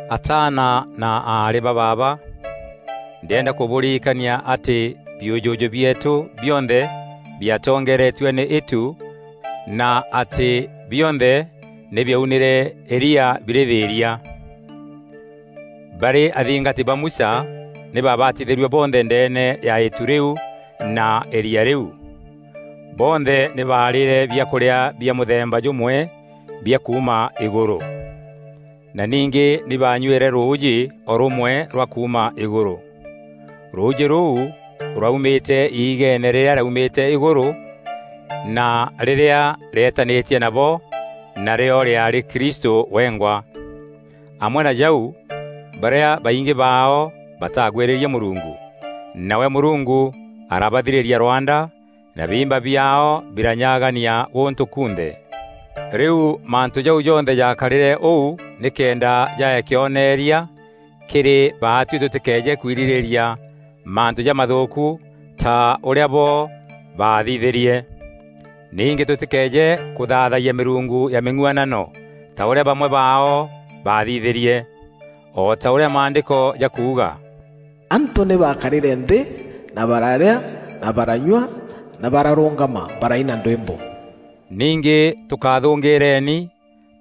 Ataana na aarî ba baaba, ndîenda kûbûririkania atî biûjûjû bieetû bionthe biatongeeretue nî îtu na atî bionthe nî biaunîre îria birî thîîria. Barî athingati ba Musa nî babatithîrue bonthe ndeene ya îtu rîu na îria rîu. Bonthe nî baarîre biakûrîa bia mûthemba jûmwe bia kuuma îgûrû, na ningî nî banyuîre rûûjî o rûmwe rwa kuuma îgûrû. Rûûjî rûu rwaumîte igeene rîrîa rîaumîte îgûrû na rîrîa rîetanîtie nabo, narîo rîaarî Kristû wengwa. Amwe na jau, barîa baingî baao bataagwîrîrie Mûrungu, nawe Mûrungu arabathirîria rwanda na biimba biaao biranyagania gûntû kunthe. Rîu mantû jau jonthe jaakarîre ûu nîkenda jaae kîonereria kîrî baatuî tûtîkeeje kwirîrîîria mantû jamathûûku ta ûrîa bo baathithîrie. Ningî tûtîkeeje kûthaathayia mîrungu ya mîng'uanano, ta ûrîa bamwe baao baathithîrie. O ta ûrîa Maandîko jakuuga, “Antû nî baakarîre nthî na bararîa na baranyua na bararûngama, baraina ndwîmbo.” Ningî tûkathûngîîreni,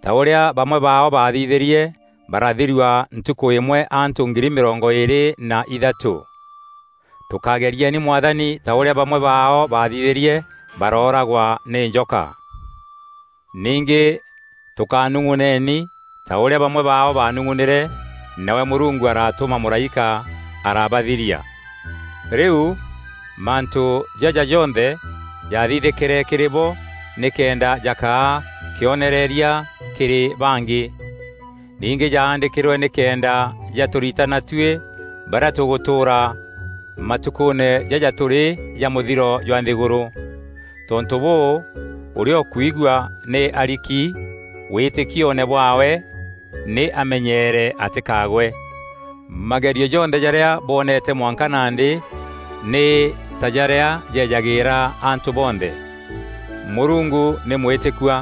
ta ûrîa bamwe baao baathithîrie barathirua ntukû îmwe antû ngiri mîrongo îîrî na ithatû. Tûkágerieni Mwathani ta ûrîa bamwe baao baathithîrie barooragwa nî njoka. Ningî tûkanung'uneni ta ûrîa bamwe baao baanung'unîre nawe Mûrungu aratûma mûraîka araabathiria. Rîu, mantû jaja jonthe jaathithîkîre kîrî bo nîkenda jakaa kîonereria kîrî bangî. Ningî jaandîkîrwe nîkenda jatûritana tuî barîa tûgûtûûra matukûûne jaja tûrî ja mûthiro jwa nthîgûrû. Tontû bûû ûrîa ûkwigua nî ariki wîtîkioone bwaawe nî amenyeere atîkagwe. Magerio jonthe jarîa bwonete mwanka nandî nî ta jarîa jejagîîra antû bonthe. Mûrungu nî mwîtîkua,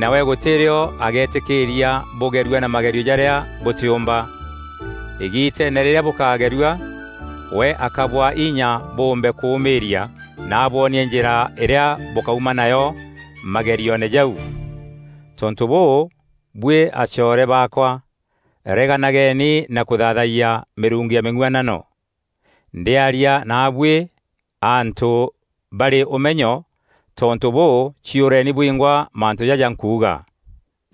nawe gûtî rîo agetîkîîria bûgerua na magerio jarîa bûtîûmba. Îgiiteene rîrîa bûkagerua, we akabwaa inya bûûmbe kûûmîîria na abwonie njîra îrîa bûkauma nayo magerioone jau. Tontû bûû, buî acoore baakwa, reganageni na kûthaathayia mîrungu ya mîng'uanano. Ndîaria naabuî antû barî ûmenyo, tontû bûû ciûreni bwingwa mantû jaja nkuuga.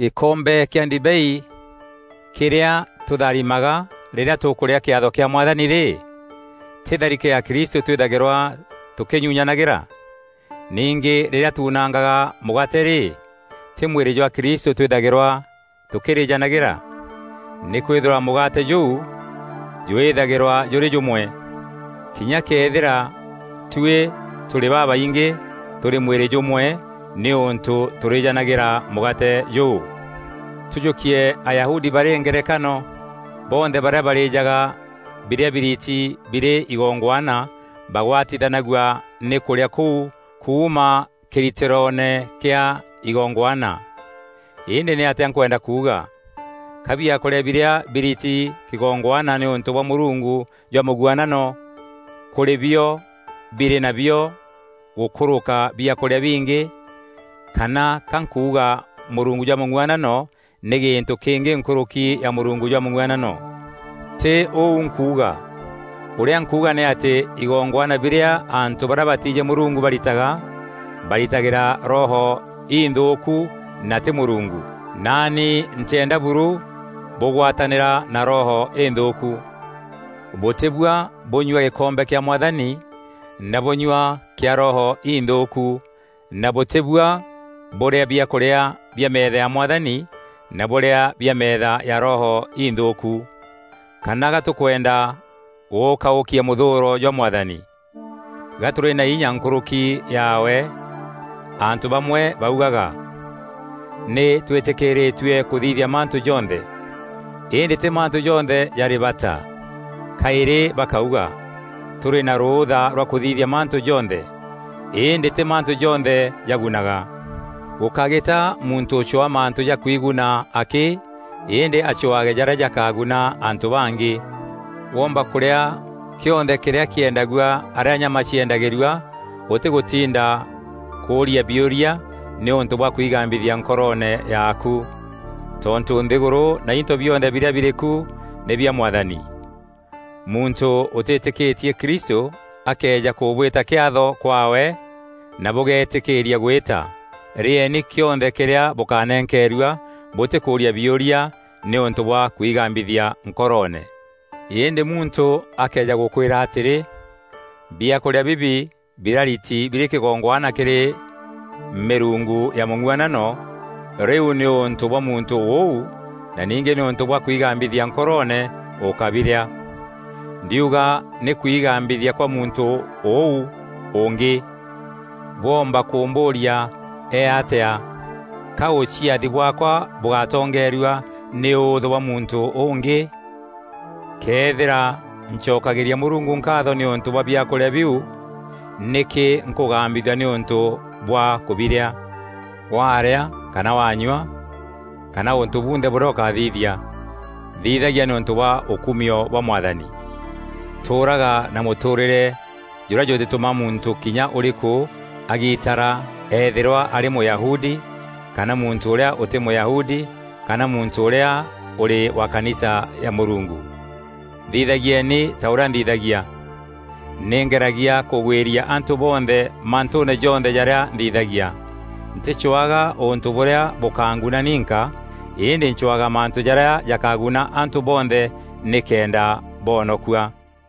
Gîkombe kîa ndibei kîrîa tûtharîmaga rîrîa tûkûrîa kîatho kîa Mwathani rî, tî tharîke ya Kristû twîthagîrwa tûkînyunyanagîra? Ningî rîrîa tuunangaga mûgaate rî, tî mwîrî jwa Kristû twîthagîrwa tûkîrîjanagîra? Nîkwîthîrwa mûgaate jûu jwîthagîrwa jûrî jûmwe, kinya këethîra tuî tûrî babaingî, tûrî mwîrî jûmwe nîûntû tûrîjanagîîra mûgaate jûu. Tûjûkie Ayahudi barî ngerekano; bonthe barîa barîjaga birîa biriti birî igongwana bagwatithanagua nî kûrîa kûu kuuma kîritîroone kîa igongwana. Îndî nîatîa nkwenda kuuga? Ka biakûrîa birîa biriti kîgongwana nîûntû bwa mûrungu jwa mûng'uanano kûrîbio birî nabio gûkûrûka biakûrîa bingi? Kana ka nkuuga mûrungu jwa mûng'uanano nî gîntû kîngî nkûrûki ya mûrungu jwa mûng'uanano? Ti ûu nkuuga! Ûrîa nkuuga nî atî igongwana birîa antû barîa batiijî Mûrungu baritaga, baritagîra roho inthûûku na tî Mûrungu. Naani ntîenda buru bûgwatanîra na roho înthûûku. Bûtîbua bûnyua gîkombe kîa Mwathani na bûnyua kîa roho inthûûku, na bûtîbua bûrîa biakûrîa bia meetha ya Mwathani na bûrîa bia meetha ya roho ithûûku. Kana ga tûkwenda gûûkaûkia mûthûûro jwa Mwathani? Ga tûrî na inya nkûrûki yaawe? Antû bamwe baugaga, “Nî twîtîkîîirîtue kûthithia mantû jonthe.” Îndî tî mantû jonthe jarî bata. Kaîrî bakaûga, “Tûrî na rûûtha rwa kûthithia mantû jonthe.” Îndî tî mantû jonthe jagunaga. Gûkágîta muntû ûcwaa mantû ja kwiguna akî, îndî acwaage jarîa jakaguna antû bangî. Womba kûrîa kîonthe kîrîa kîendagua arîa nyama ciendagîrua ûtîgûtinda kûria biûria nîûntû bwa kwigambithia nkoroone yaaku. Tontû nthîgûrû na into bionthe birîa birîku nî bia Mwathani. Muntû ûtîtîkîtie Kristû akëeja kûbwîta kîatho kwaawe, na bûgetîkîîria gwîta, rîeeni kîonthe kîrîa bûkanenkeerua bûtîkûûria biûria nîûntû bwa kwigambithia nkoroone. Îndî muntû akëeja gûkwîra atîrî, “Biakûrîa bibi birariti birî kîgongwana kîrî mîrungu ya mûng'uanano,” rîu nîûntû bwa muntû ûu na ningî nîûntû bwa kwigambithia nkoroone, ûkábirîa. Ndiuga nî kwigambithia kwa muntû ûu ûngî. Bwoomba kûmbûûria, “Ee atîa?” Ka ûciathi bwaakwa bûgatongerua nî ûûthû bwa muntû ûngî? Këethîra ncokagîria Mûrungu nkaatho nîûntû bwa biakûrîa biû, nîkî nkûgambithua nîûntû bwa kûbirîa? Waarîa kana wanyua, kana ûntû bunthe bûrîa ûkathithia, thithagia nîûntû bwa ûkumio bwa Mwathani. Tûûraga na mûtûûrîre jûrîa jûtîtûma muntû kinya ûrîkû agitara eethîrwa arî Mûyahudi, kana muntû ûrîa ûtî Mûyahudi kana muntû ûrîa ûrî wa kanisa ya Mûrungu. Thithagieni ta ûrîa nthithagia; nî ngeragia kûgwîria antû bonthe mantûûne jonthe jarîa nthithagia. Ntîcwaga ûntû bûrîa bûkanguna ninka îndî ncwaga mantû jaarîa jakaguna antû bonthe nîkenda boonokua.